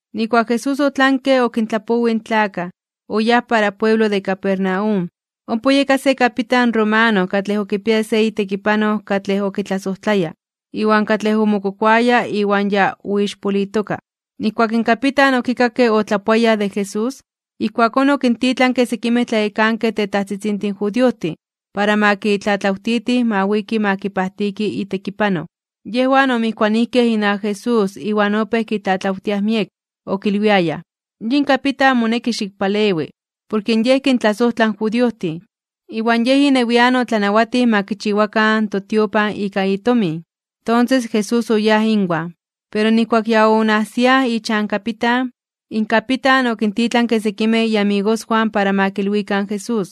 Nijkuak Jesús otlanke okintlapowij in tlakaj, oyáj para pueblo de Capernaum. Ompa oyeka se kapitan romano katlej okipiaya se itekipanoj katlej okitlasojtlaya, iwan katlej omokokoaya iwan ya oixpolitoka. Nijkuak in kapitan okikakke otlapoayaj de Jesús, ijkuakón okintitlanke sekimej tlayekankej tetajtzitzintin judiojtin para ma kitlatlawtitij ma wiki ma kipajtiki itekipanoj. Yejwan omijkuanijkej inawak Jesús iwan opéj kitlatlawtiaj miek, okilwiayaj: ―Yin kapitan moneki xikpalewi, porke yej kintlasojtla in judiojtin, iwan yej inewian otlanawatij ma kichiwakan totiopan ika itomin. Tonses Jesús oyáj inwan. Pero nijkuak ya onajsiaj ichan kapitan, in kapitan okintitlanke sekimej iamigoswan para ma kilwikan in Jesús: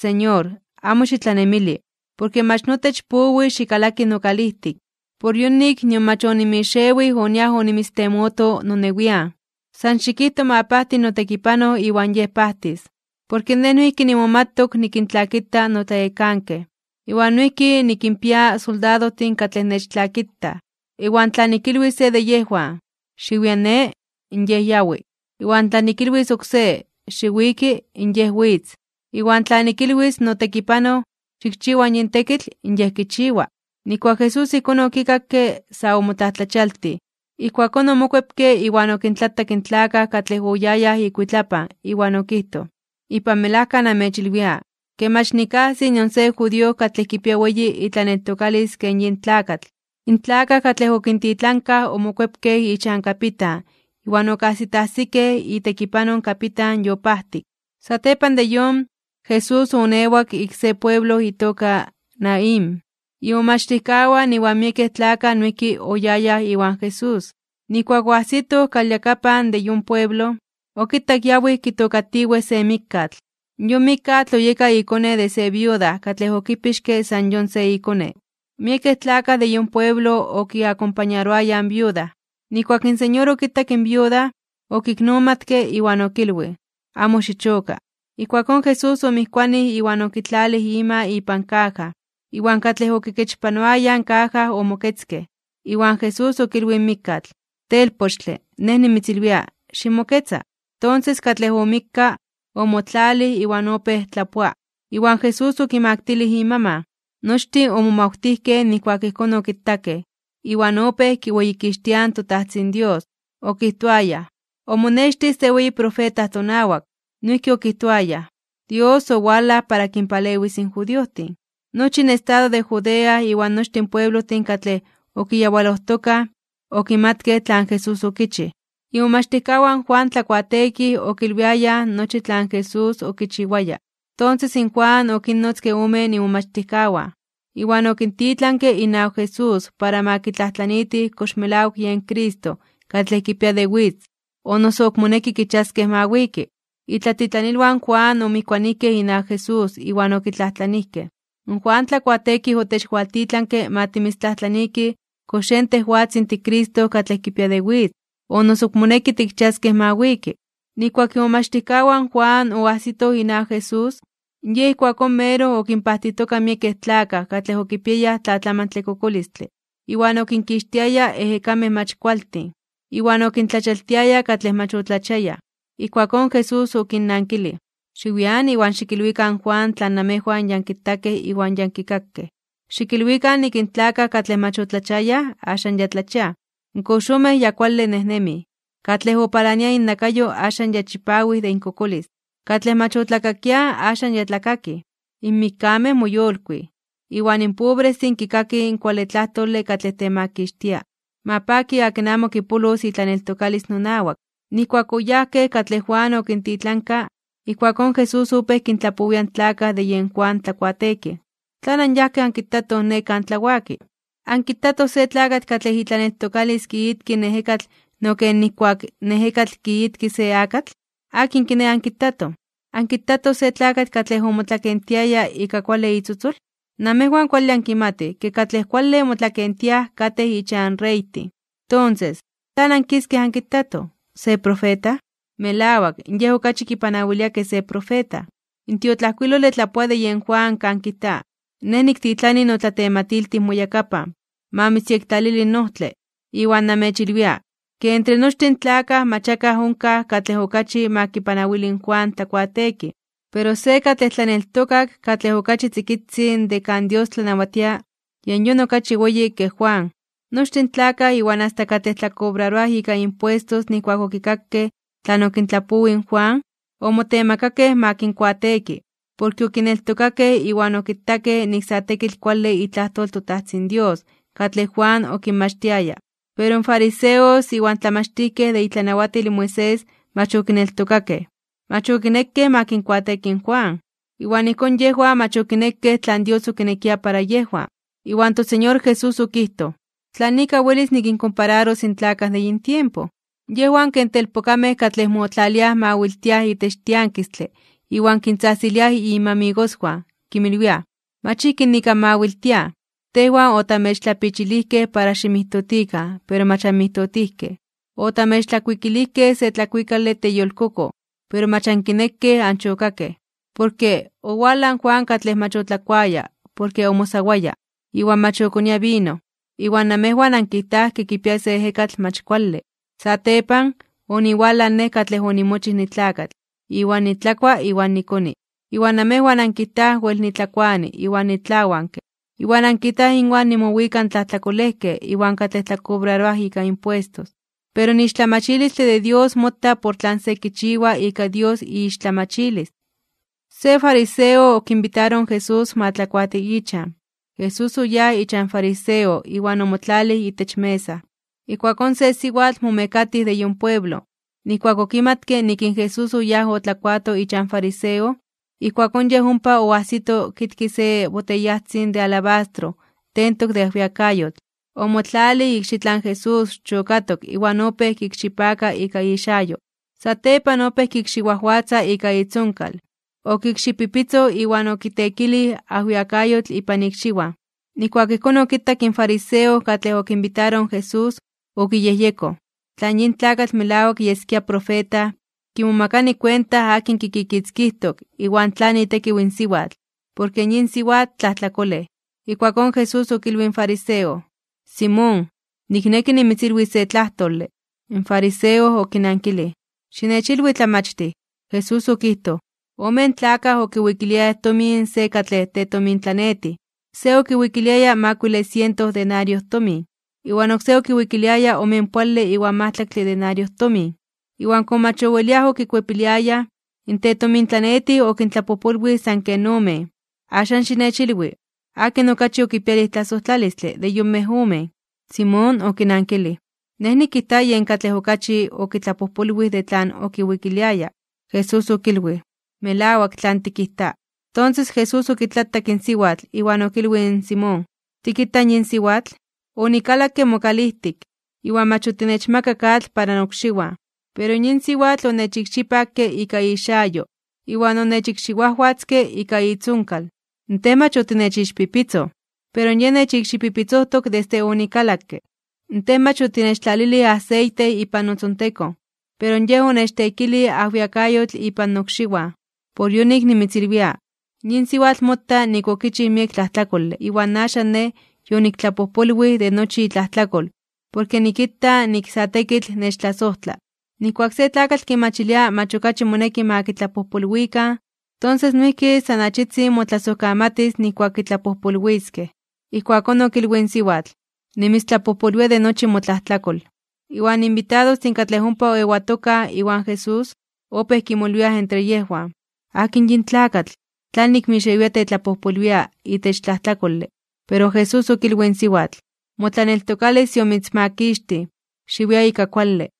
―Señor, amo xitlanemili, porke mach notech powi xikalaki nokalijtik. Por yonik nion mach onimixewij oniaj onimitztemoto nonewian. San xikijto ma pajti notekipanoj iwan yej pajtis. Porke nej noijki nimomatok nikintlakita notlayekankej. Iwan noijki nikinpia soldadojtin katlej nechtlakitaj. Iwan tla nikilwis se de yejwan: “Xiwia ne”, in yej yawi. Iwan tla nikilwis oksé: “Xiwiki”, in yej witz. Iwan tla nikilwis in notekipanoj: “Xikchiwa yin tekitl”, in yej kichiwa. Nijkuak Jesús ijkón okikakke, sa omotlajtlachialtij (omomajmawtij). Ijkuakón omokuepke iwan okintlatak in tlakaj katlej oyayaj ikuitlapan iwan okijtoj: ―Ipan melajka namechilwia, ke mach nikajsi nion se judío katlej kipia weyi itlaneltokalis ken yin tlakatl. In tlakaj katlej okintitlankaj omokuepkej ichan kapitan iwan okajsitajsikej itekipanoj in kapitan yopajtik. Satepan de yon, Jesús oonewak ik se pueblo itoka Naín. Imomachtijkawan iwan miekej tlakaj noijki oyayaj iwan Jesús. Nijkuak oajsitoj kalyakapan de yon pueblo, okitak yawij kitookatiwej se mikkatl. Yon mikkatl oyeka ikone se viuda katlej okipixke san yon se ikone. Miekej tlakaj de yon pueblo okiakompañaroayaj in viuda. Nijkuak in Señor okitak in viuda, okiknomatke iwan okilwij: ―Amo xichoka. Ijkuakón Jesús omijkuanij iwan okitlalij ima ipan kaja. Iwan katlej okikechpanoayaj in kaja omoketzkej. Iwan Jesús okilwij in mikkatl: ―Telpochtle, Nej nimitzilwia: ¡Ximoketza! Tonses katlej omikka, omotlalij iwan opéj tlapoa, iwan Jesús okimaktilij imaman. Nochtin omomawtijkej nijkuak ijkón okitakej, iwan opéj kiweyikixtiaj in toTajtzin Dios, okijtoayaj: ―Omonextij se weyi profeta tonawak. Noijki okijtoayaj: ―Dios owalaj para kinpalewis in judiojtin. Nochi in estado de Judea iwan nochtin pueblojtin katlej okiyawalojtokaj, okimatkej tlan Jesús okichij. Imomachtijkawan in Juan Tlakuateekij okilwiayaj nochi tlan Jesús okichiwaya. Tonses in Juan okinnotzke omen imomachtijkawan, iwan okintitlanke inawak Jesús para ma kitlajtlaniitij kox melawak yen Cristo katlej kipia de witz, o noso ok moneki kichiaskej ma wiki. Itlatitlanilwan in Juan omijkuanijkej inawak Jesús, iwan okitlajtlanijkej: ―In Juan Tlakuateekij otechwaltitlanke ma timitztlajtlaniikij kox yen tejwatzin tiCristo katlej kipia de witz, o noso ok moneki tikchiaskej ma wiki. Nijkuak imomachtijkawan in Juan oajsitoj inawak Jesús, Yej ijkuakón meroj okinpajtijtoka miekej tlakaj katlej okipiayaj tlatlamantle kokolistle, iwan okinkixtiaya ejekamej mach kualtin, iwan okintlachialtiaya katlej mach otlachiayaj. Ijkuakón Jesús okinnankilij: ―Xiwian iwan xikilwikan in Juan tlan namejwan ya ankitakej iwan ya ankikakej. Xikilwikan nik in tlakaj katlej mach otlachiayaj axan ya tlachiaj, in koxomej ya kuale nejnemij, katlej opalania innakayo axan ya chipawij de inkokolis, katlej mach otlakakiaj axan ya tlakakij, in mikkamej moyolkuij, iwan in pobrestin kikakij in kuale tlajtole katlej temakixtia. Ma paki akin amo kipolos itlaneltokalis nonawak. Nijkuak oyajkej katlej Juan okintitlanka, ijkuakón Jesús opéj kintlapowia in tlakaj de yen Juan Tlakuateekij: ―¿Tlan anyajkej ankitatoj ne kan tlawaki? ¿Ankitatoj se tlakatl katlej itlaneltokalis kiitki in ejekatl no ken ijkuak in ejekatl kiitki se akatl? ¿Akin kiné ankitatoj? ¿Ankitatoj se tlakatl katlej omotlakentiaya ika kuale itzotzol? Namejwan kuale ankimatij ke katlej kuale motlakentiaj katej ichan reytin. Tonses, ¿tlan ankiskej ankitatoj? ¿Se profeta? Melawak, yej okachi kipanawilia ke se profeta. In tiotlajkuilole tlapoa de yen Juan kan kijta: Nej niktitlani notlatematiltij moyakapan, ma mitzyektlalili in ojtle. Iwan namechilwia, ke entre nochtin in tlakaj mach akaj onkaj katlej okachi ma kipanawili in Juan Tlakuateekij. Pero se tlaneltokak katlej okachi tzikitzin de kan Dios tlanawatia yen yon okachi weyi ke Juan. Nochtin in tlakaj iwan asta katlej tlakobraroaj ika impuestos nijkuak okikakej tlan okintlapowij in Juan, omotemakakej ma kinkuateeki, porke okineltokakej iwan okitakej nik sa tekitl kuale itlajtol in toTajtzin Dios katlej Juan okinmachtiaya. Pero in fariseos iwan in tlamachtijkej de itlanawatil in Moisés mach okineltokakej, mach okinekej ma kinkuateeki in Juan, iwan ijkón yejwan mach okinekej tlan Dios okinekia para yejwan. Iwan toSeñor Jesús okijtoj: ―¿Tlan ika welis nikinkompararos in tlakaj de yin tiempo? Yejwan ken telpokamej katlej motlaliaj mawiltiaj itech tiankistle iwan kintzajtziliaj inmamigoswan, kinmilwiaj: “Mach ijki nik anmawiltiaj. Tejwan otamechtlapichilijkej para ximijtotikan, pero mach anmijtotijkej. Otamechtlakuikilijkej se tlakuikale teyolkokoj, pero mach ankinekej anchokakej.” Porke, owalaj in Juan katlej mach otlakuaya porke omosawaya (oayunaroaya) iwan mach okonia vino, iwan namejwan ankijtaj ke kipia se ejekatl mach kuale. Satepan, oniwalaj Nej katlej onimochij nitlakatl, iwan nitlakua iwan nikoni. Iwan namejwan ankijtaj wel nitlakuani iwan nitlawanke, iwan ankijtaj inwan nimowika in tlajtlakolejkej iwan katlej tlakobraroaj ika impuestos. Pero in ixtlamachilistle de Dios mota por tlan se kichiwa ika Dios iixtlamachilis. Se fariseo okinbitaroj in Jesús ma tlakuati ichan. Jesús oyáj ichan fariseo iwan omotlalij itech mesa. Ijkuakón se siwatl momekatij de yon pueblo, nijkuak okimatke nik in Jesús oyáj otlakuato ichan fariseo, ijkuakón yej ompa oajsito okitkia se boteyajtzin de alabastro tentok de ajwiakayotl. Omotlalij ikxitlan Jesús chokatok iwan opéj kikxipaka ika ixayo. Satepan opéj kikxiwajwatza ika itzonkal, okikxipipitzoj iwan okiteekilij ajwiakayotl ipan ikxiwan. Nijkuak ijkón okitak in fariseo katlej okinbitaroj in Jesús, okiyejyekoj: “Tla yin tlakatl melawak yeskia profeta, kimomakani kuenta akin kikikitzkijtok iwan tlan itekiw in siwatl, porke yin siwatl tlajtlakolej.” Ijkuakón Jesús okilwij in fariseo: ―Simón, nikneki nimitzilwis se tlajtole. In fariseo okinankilij: ―Xinechilwi, Tlamachtij. Jesús okijtoj: ―Omen tlakaj okiwikiliayaj tomin se katlej tetomintlanetij. Se okiwikiliaya makuile siento denariojtomin, iwan oksé okiwikiliaya omenpoale iwan majtlaktle denariojtomin. Iwan komo mach oweliaj okikuepiliayaj, in tetomintlanetij okintlapojpolwij san ken omen. Axan xinechilwi, ¿akin okachi okipialij tlasojtlalistle de yonmej omen? Simón okinankilij: ―Nej nikijta yen katlej okachi okitlapojpolwij de tlan okiwikiliaya. Jesús okilwij: ―Melawak tlan tikijta. Tonses Jesús okitlatak in siwatl, iwan okilwij in Simón: ―¿Tikita yin siwatl? Onikalakke mokalijtik, iwan mach otinechmakak atl para nokxiwan. Pero yin siwatl onechikxipakke ika ixayo, iwan onechikxiwajwatzke ika itzonkal. Tej mach otinechixpipitzoj, pero yej nechikxipipitzojtok desde onikalakke. Tej mach otinechtlalilij aseite ipan notzontekon, pero yej onechteekilij ajwiakayotl ipan nokxiwan. Por yonik nimitzilwia, yin siwatl mota nik okichij miek tlajtlakole iwan axan Nej yoniktlapojpolwij de nochi itlajtlakol porke nikita nik sa tekitl nechtlasojtla. Nijkuak se tlakatl kimachilia mach okachi moneki ma kitlapojpolwikan, tonses noijki san achitzin motlasojkamatis nijkuak kitlapojpolwiskej. Ijkuakón okilwij in siwatl: ―Nimitztlapojpolwia de nochi motlajtlakol. Iwan inbitadostin katlej ompa oewatokaj iwan Jesús, opéj kimolwiaj entre yejwan: ―¿Akin yin tlakatl? ¿Tlanik mixewia tetlapojpolwia itech tlajtlakole? Pero Jesús okilwij in siwatl: ―Motlaneltokalis yomitzmakixtij. Xiwia ika kuale.